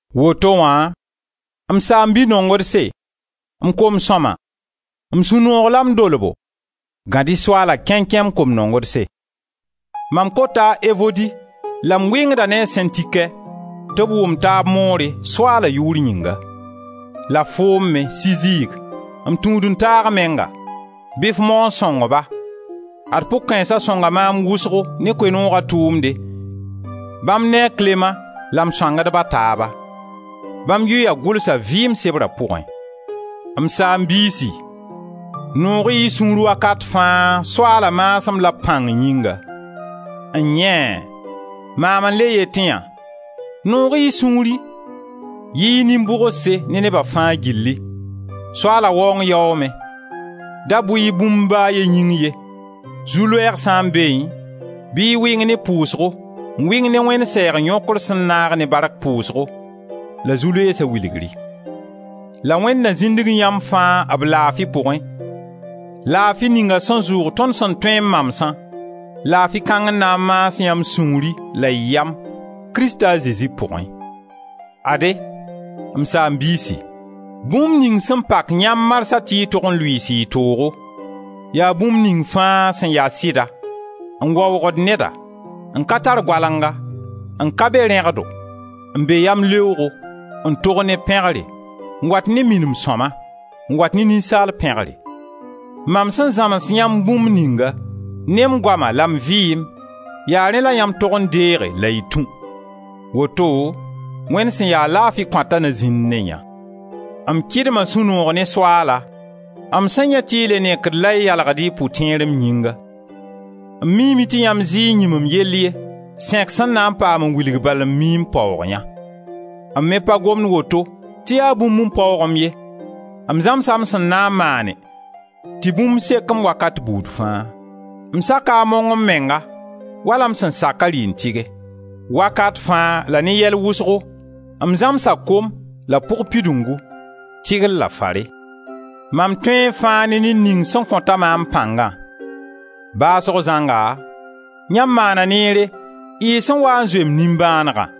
Woto wã, m saam-bi-nongdse, m kom-sõma, m sũ-noog la m dolbo, gãd-y Soaala kẽnkẽ, m kom-nongdse. Mam kota a Evodi la m wɩngda ne a Sẽntikɛ, tɩ b wʋm taab moore, Soaala yʋʋr yĩnga. La foom me Sizig, m tũud-n-taag menga, bɩ f mao n sõng-ba; ad pʋg-kãensa sõnga maam wʋsgo ne Koe-nooga tʋʋmde, bãmb ne a Klema la m sõangdb a taaba: bãmb yʋya gʋlsa vɩɩm sebra pʋgẽ. M saam-biisi, noog-y y sũur wakat fãa, Soaala maasem la b pãng yĩnga. N-yẽe! Maam n le yet yã: noog-y y sũuri! Yɩ-y nin-bʋgse ne neba fãa gilli. Soaala waoong yaoome. Da bʋ-y bũmb ba a ye yĩng ye. Zu-loɛɛg sã n beẽ, bɩ y wɩng ne pʋʋsgo, n wɩng ne Wẽnd sɛɛg yõkr sẽn naag ne bark pʋʋsgo, la zu-loeesa wilgri. La Wẽnd na zĩndg yãmb fãa b laafi pʋgẽ, laafi ninga sẽn zʋʋg tõnd sẽn tõe n mamsã, laafi kãng n na n maas yãmb sũuri la y yam, Krista a Zezi pʋgẽ. Ade, m saam-biisi, bũmb ning sẽn pak yãmb marsã tɩ y tog n lʋɩɩs y toogo, yaa bũmb ning fãa sẽn ya sɩda, n waoogd neda, n ka tar goalenga, n ka be rẽgdo, n be yamleoogo, n tog ne pẽgre, n wat ne minim sõma, n wat ne ninsaal pẽgre. Mam sẽn zãms yãmb bũmb ninga ne m goama la m vɩɩm, yaa rẽ la yãmb tog n deege la y tũ; woto Wẽnd sẽn ya laafi kõata na zĩnd ne-yã. M kɩdma sũ-noog ne Soaala, m sẽn yãe tɩ y le nekd la y yalgd y pʋtẽer m yĩnga. M miime tɩ yãmb zɩ n yĩm m yell ye; sẽk sẽn na paam n wilga bal n mii n paoog yã. M me pa gomd woto tɩ yaa bũmb n paoog-m ye, m zãmsa m sẽn na maane tɩ bũmb sek-m wakat buud fãa. M saka a mong m menga wala m sẽn sak a rɩ n tɩge. Wakat fãa la ne yɛl wʋsgo m zãmsa kom la pʋg pidungu, tɩgr la fare. Mam tõe fãa ne ned ning sẽn kõta maam pãngã. Baasg zãnga, yãmb maana neere y sẽn waa n zoe m nimbãanegã.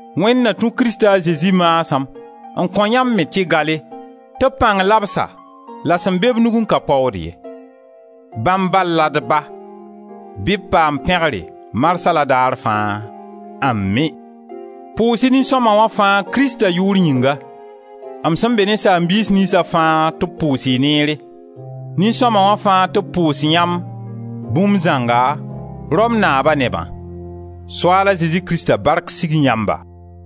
Wẽnd na tũ Krista a Zezi maasem n kõ yãmb me tɩ gale, tɩ b pãng labsa la sẽn be b nugẽ ka paood ye. Bãmb bal la d Ba, bɩ b paam pẽgre marsã la daar fãa! Ami! Pʋʋs-y nin-sõma wã fãa Krista yʋʋr yĩnga. M sẽn be ne saam-biis niynsa fãa tɩ b pʋʋs-y neere! Nin-sõma wã fãa tɩ b pʋʋs-yãmb, bũmb zãnga Rom naaba nebã. Soaala Zezi Krista bark sig yãmba!